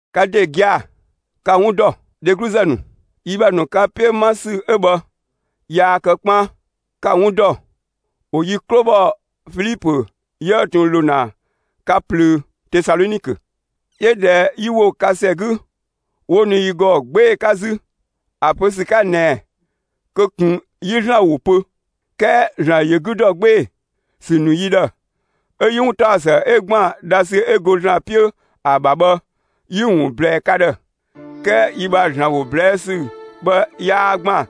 Ka ‑de gia‑, ka‑ 'wun ‑dɔ, dhegluzë ‑nu, yi ‑bha ‑nu ka 'piö 'ma ‑sü 'ö bhë yaa kë 'kpaan. Ka‑ 'wun ‑dɔ, ‑wo yi 'klo ‑bhɔ Filipö 'yië ꞊tun ‑lo ‑na ka ꞊plöö Tesalɔnikö. 'Yö ꞊dhɛ 'yi ‑wo ka ‑sɛ 'gü, 'wo ‑nu yi ‑gɔ 'gbee‑ 'ka 'zü, ‑a pö ‑sü 'ka ꞊nɛɛ kö ꞊kun 'yi ‑Zlan ‑wo pö. 'Kɛɛ ‑Zlan ‑yö 'gü ‑dɔ 'gbee‑ ‑sü ‑nu yi ‑dhë, 'ö 'yi 'wuntaɔsë 'ö ‑gban dhasü 'ö go ‑Zlan 'piö ‑a ‑bha bhë, 'yi‑ ‑wun ꞊blɛɛ ka ‑dhë. 'Kɛɛ yi ‑bha ‑Zlan ‑wo ꞊blɛɛ' ‑sü bhë 'yaa ‑gban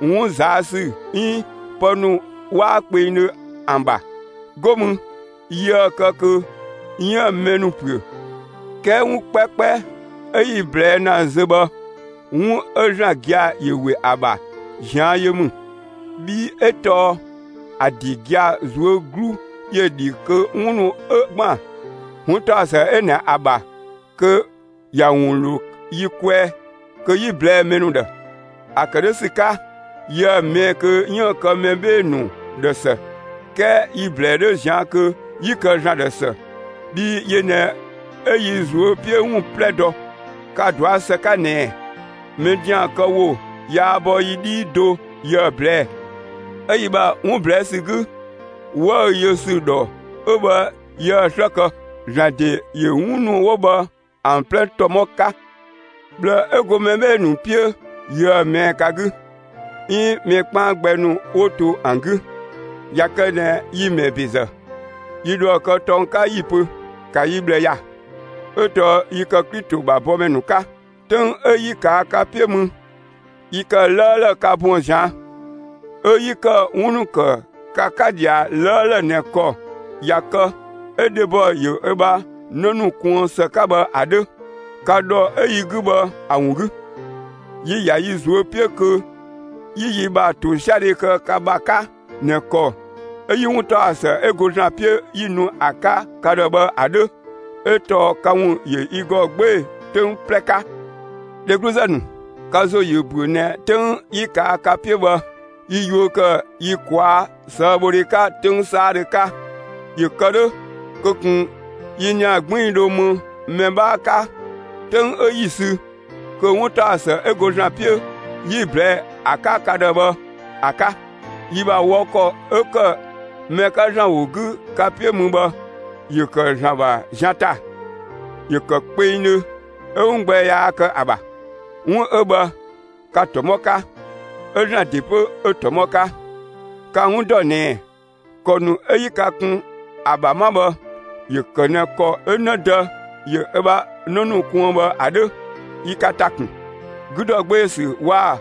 'wun ꞊zaa' ‑sü 'iin pë ‑nu 'waa kpengdhö ‑an ‑bha. 'Go mü, yiëë‑ kë kö 'yiën‑ mɛ ‑nu ‑püö. 'Kɛɛ 'wun 'kpɛkpɛ 'ö 'yi‑ ꞊blɛɛ' ‑na zö bhë 'wun 'ö ‑Zlan gia‑ ‑yö ‑we ‑a ‑bha ꞊zian' yö ‑mü. Bhii 'ö tɔɔ ‑a ‑de gia‑ ꞊zuö' 'glu ‑yö ‑dhi kö 'wun ‑nu 'ö ‑gban 'wuntaɔsë 'ö ꞊nɛ ‑a ‑bha, kö ‑ya ‑wun ‑lo yi kwɛɛ kö 'yi‑ ꞊blɛɛ'‑ mɛ ‑nu ‑dhë. ‑A ‑kë 'dhö ‑sü 'ka, yiëë‑ ꞊mɛɛ'‑ kö 'yiën‑ kë mɛ 'bhee‑ ‑nu ‑dhë ‑së, 'kɛɛ yi‑ ‑blɛɛ 'dhö ꞊zian' kö 'yi kë ‑Zlan ‑dhë ‑së; bhii yö ꞊nɛ 'ö yi ꞊zuö' 'piö ‑wun 'plɛ dɔ. Ka‑ dɔa ‑së 'ka ꞊nɛɛ: Mɛ ‑dian kë ‑wo yaa bɔ yi 'dhii do yiëë‑ ꞊blɛɛ'‑; 'ö yi ‑bha 'wun ꞊blɛɛ' ‑sü 'gü, 'wëü‑ yö ‑sü ‑dhɔ 'ö bhë, yië‑ 'slë kë. ‑Zlan ‑de ‑yö 'wun ‑nu 'wo bhë ‑an 'plɛ ‑tɔmɔ 'ka. ꞊Bhlë 'ö go mɛ 'bhee‑ ‑nu 'piö yiëë‑ ꞊mɛɛ'‑ ka 'gü, 'iin mɛ 'kpaan gbɛ ‑nu 'wo to ‑an 'gü. ꞊Ya kë ꞊nɛ yi‑ ‑mɛɛ ‑bezë, yi dhoë‑ kë tɔng 'ka 'yi‑ pö: ‑Ka yi ꞊bhlë ‑ya! 'Ö tɔɔ yi ‑kë Klito ‑bha bɔmɛ ‑nu 'ka. 'Töng 'ö 'yi ꞊kaa' ka 'piö mü, yi ‑kë 'lëëlë ka buën‑ ꞊zian', 'ö 'yi ‑kë 'wun ‑nu ‑kë ka 'ka ꞊dhia 'lëëlë ꞊nɛ ‑kɔ ꞊ya kë, 'ö dhebɔ ‑yö ö ‑bha 'në ‑nu kuën ‑së 'ka bhë ‑a 'dhö. Ka ‑dhɔ 'ö yi 'gü bhë ‑a ‑wun 'gü, yi‑ ‑ya yi ꞊zuö' 'piö kö 'yi yi ‑bha ‑tosiadhe kë ka ‑bha 'ka ꞊nɛ ‑kɔ 'ö 'yi 'wuntaɔsë 'ö go ‑Zlan 'piö 'yi‑ nu ‑a 'ka ka ‑dhë bhë ‑a 'dhö. 'Ö tɔɔ ka ‑wun ‑yö yi ‑gɔ 'gbee‑ 'töng 'plɛ 'ka. Dhegluzë ‑nu, ka ‑zo ‑yö ‑büö ꞊nɛ 'töng 'yi ꞊kaa' ka 'piö bhë, yi yuö ‑kë yi ꞊kwaa' ꞊sëëbhodhe 'ka 'töng 'saadhö 'ka, ‑yö kë 'dhö kö ꞊kun yi ‑nia 'gbiin‑ dho më mɛ 'bhaa 'ka 'töng 'ö 'yi‑ sü kö 'wuntaɔsë 'ö go ‑Zlan 'piö 'yi‑ ꞊blɛɛ'‑ ‑a 'ka ka ‑dhë bhë ‑a 'ka. Yi ‑bha wɔ ‑kɔ 'ö‑ ‑kë mɛ 'ka ‑Zlan ‑wo 'gü ka 'piö mü bhë, ‑yö ‑kë ‑Zlan ‑bha zian ‑ta; ‑yö ‑kë kpengdhö 'ö 'wun gbɛ yaa kë ‑a ‑bha. 'Wun 'ö bhë, ka‑ ‑tɔmɔ 'ka; 'ö ‑Zlan ‑de 'pö, 'ö‑ ‑tɔmɔ 'ka. Ka‑ 'wun ‑dɔ ꞊nɛɛ, ‑kɔ ‑nu 'ö 'yi ka kun ‑a ‑bha 'ma bhë, ‑yö ‑kë ꞊nɛ ‑kɔ 'ö 'në dë ‑yö ö ‑bha 'në ‑nu kuën bhë ‑a 'dhö. Yi ka ‑ta ‑kun, 'gü ‑dɔ 'gbee‑ ‑sü waa‑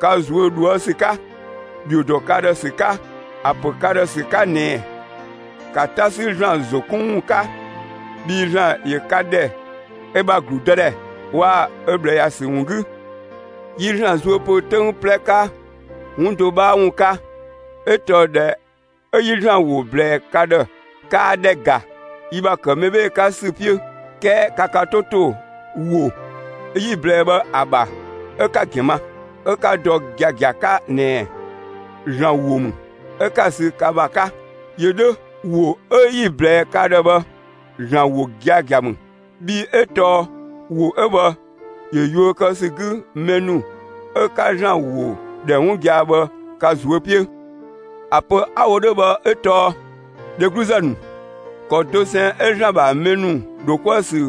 ka ꞊zuö' ꞊dhuë' ‑sü 'ka, ‑dhio ‑dɔ ka ‑dhë ‑sü 'ka, ‑a ‑pö ka ‑dhë ‑sü 'ka ꞊nɛɛ: ‑Ka 'ta 'sü ‑Zlan ‑zo 'kun ‑wun 'ka! Bhii ‑Zlan ‑yö ka ‑dhɛ ö ‑bha ‑gludëdhɛ waa‑ ö ꞊bhlë ‑ya ‑sü ‑wun 'gü. Yi ‑Zlan zuö ‑pö 'töng 'plɛ 'ka 'wun do 'bhaa ‑wun 'ka; 'ö tɔɔ ꞊dhɛ 'ö 'yi ‑Zlan ‑wo ꞊blɛɛ ka ‑dhë, kaa ‑dhɛ ‑ga yi ‑bha ‑kë mɛ 'bhee‑ 'ka ‑sü 'piö, 'kɛɛ ka ka 'to ‑to ‑wo 'yi‑ ꞊blɛɛ bhë ‑a ‑bha 'ö 'ka‑ ‑gɛn ma; 'ö 'ka‑ dɔ giagia 'ka ꞊nɛɛ: ‑Zlan ‑wo ‑mü, 'ö 'ka‑ sü ka ‑bha 'ka. ‑Yö 'dhö; ‑wo 'ö 'yi‑ ꞊blɛɛ ka ‑dhë bhë, ‑Zlan ‑wo giagia ‑mü. Bhii 'ö tɔɔ ‑wo 'ö bhë ‑yö yuö kë ‑sü 'gü mɛ ‑nu 'ö 'ka ‑Zlan ‑wo ‑dhɛ 'wun gia‑ bhë, ka ꞊zuö' 'piö. ‑A pö 'a‑ wo 'dhö bhë 'ö tɔɔ, dhegluzë ‑nu, ‑kɔ dosɛn 'ö ‑Zlan ‑bha mɛ ‑nu ‑dho 'kuë‑ ‑sü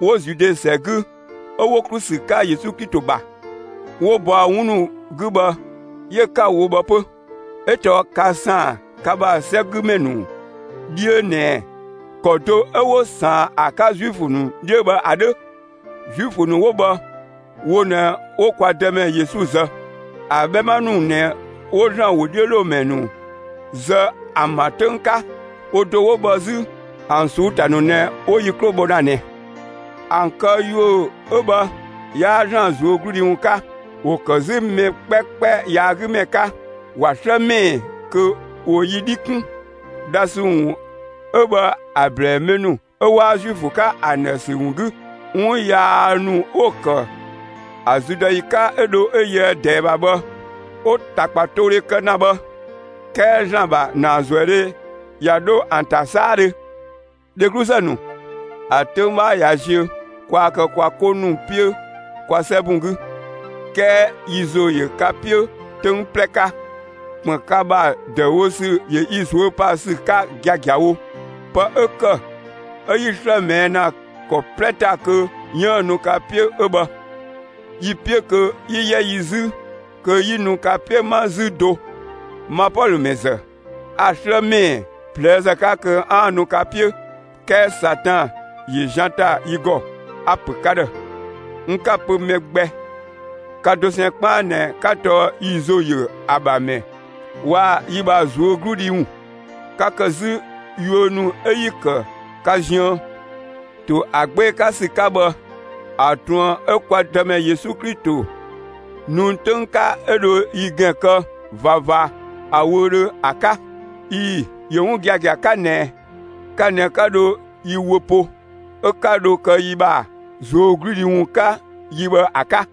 'wo Zude ‑sɛ 'gü 'ö 'wo ‑klu ‑sü 'ka Yesu Klito ‑bha, 'wo bɔa 'wun ‑nu 'gü bhë, 'yö 'ka‑ wo bhë 'pö. 'Ö tɔɔ ka ‑saan ka ‑bha 'sɛgümɛ ‑nu 'dhiö ꞊nɛɛ ‑kɔ do 'ö 'wo ꞊saan ‑a 'ka Zuifö ‑nu 'dhiö bhë ‑a 'dhö. Zuifö ‑nu 'wo bhë, wo ꞊nɛ 'wo kwa Dëmɛ Yesu zë. ‑An 'bhɛma ‑nu ꞊nɛ 'wo ‑Zlan ‑wodhiölomɛ ‑nu zë ‑an ‑bha 'töng 'ka. Wo do 'wo bhë 'zü ‑an ꞊suu'‑ ‑ta ‑nu ꞊nɛ 'wo yi 'klo bhɔ ‑na ꞊nɛ. ‑An këyuö 'ö bhë 'yaa ‑Zlan ꞊zuögludhi ‑wun 'ka. ‑Wo ‑kë 'zü mɛ 'kpɛkpɛ yaagümɛ 'ka. ‑Wa 'slë ‑mɛɛ kö ‑wo yi 'dhi 'kun, dhasü ‑wun 'ö bhë ‑a ꞊blɛɛ mɛ ‑nu 'ö 'waa Zuifö 'ka ‑an ‑dhë ‑sü ‑wun 'gü. 'Wun yaa ‑nu 'wo‑ ‑kë ‑a züdɔyi 'ka 'ö dho 'ö yöë ꞊dɛɛ ‑bha bhë, 'wo‑ ‑takpatoodhe kë ‑na bhë; 'kɛɛ ‑Zlan ‑bha ‑naazuëdhe ꞊ya 'dho ‑an ‑ta 'saadhö. Dhegluzë ‑nu, ‑a 'töng 'bhaa ꞊ya ziö kwaa kë kwa 'ko ‑nu 'piö kwa 'sɛbun 'gü; 'kɛɛ yi ‑zo ‑yö ka 'piö 'töng 'plɛ 'ka. ‑Kpën ka ‑bha ‑dëüwo ‑sü ‑yö yi ꞊zuö' pa ‑sü 'ka giagiawo. Pë 'ö ‑kë 'ö 'yi‑ 'slë ꞊mɛɛ' ‑na ‑kɔ 'plɛ ‑ta kö 'yiën‑ nu ka 'piö 'ö bhë. Yi‑ 'piö kö 'yi 'yɛ yi 'zü kö 'yi nu ka 'piö 'ma 'zü do. Ma Pɔlö ‑mɛ ‑zë, a 'slë ‑mɛɛ ꞊plëëzë 'ka kö 'aan‑ nu ka 'piö, 'kɛɛ Satan ‑yö zian ‑ta yi ‑gɔ. A‑ ‑pö ka, n 'ka‑ pö mɛ gbɛ; ka dosɛn 'kpaan ꞊nɛ 'ka tɔɔ yi ‑zo ‑yö ‑an ‑bha ‑mɛ waa‑ yi ‑bha ꞊zuögludhi ‑wun. Ka ‑kë 'zü yuö ‑nu 'ö yi‑ ‑kë ka ziën ‑to ‑a 'gbee‑ 'ka ‑sü 'ka bhë ‑a ꞊truën 'ö kwa Dëmɛ Yesu nu 'töng 'ka 'ö dho yi ‑gɛn kë ꞊vava ‑a wöödhö ‑a 'ka. ꞊Ii‑, ‑yö 'wun giagia 'ka ꞊nɛ ka ꞊nɛ 'ka dho yi wö po, 'ö 'ka dho kë yi ‑bha ꞊zuögludhi ‑wun 'ka yi bhë ‑a 'ka.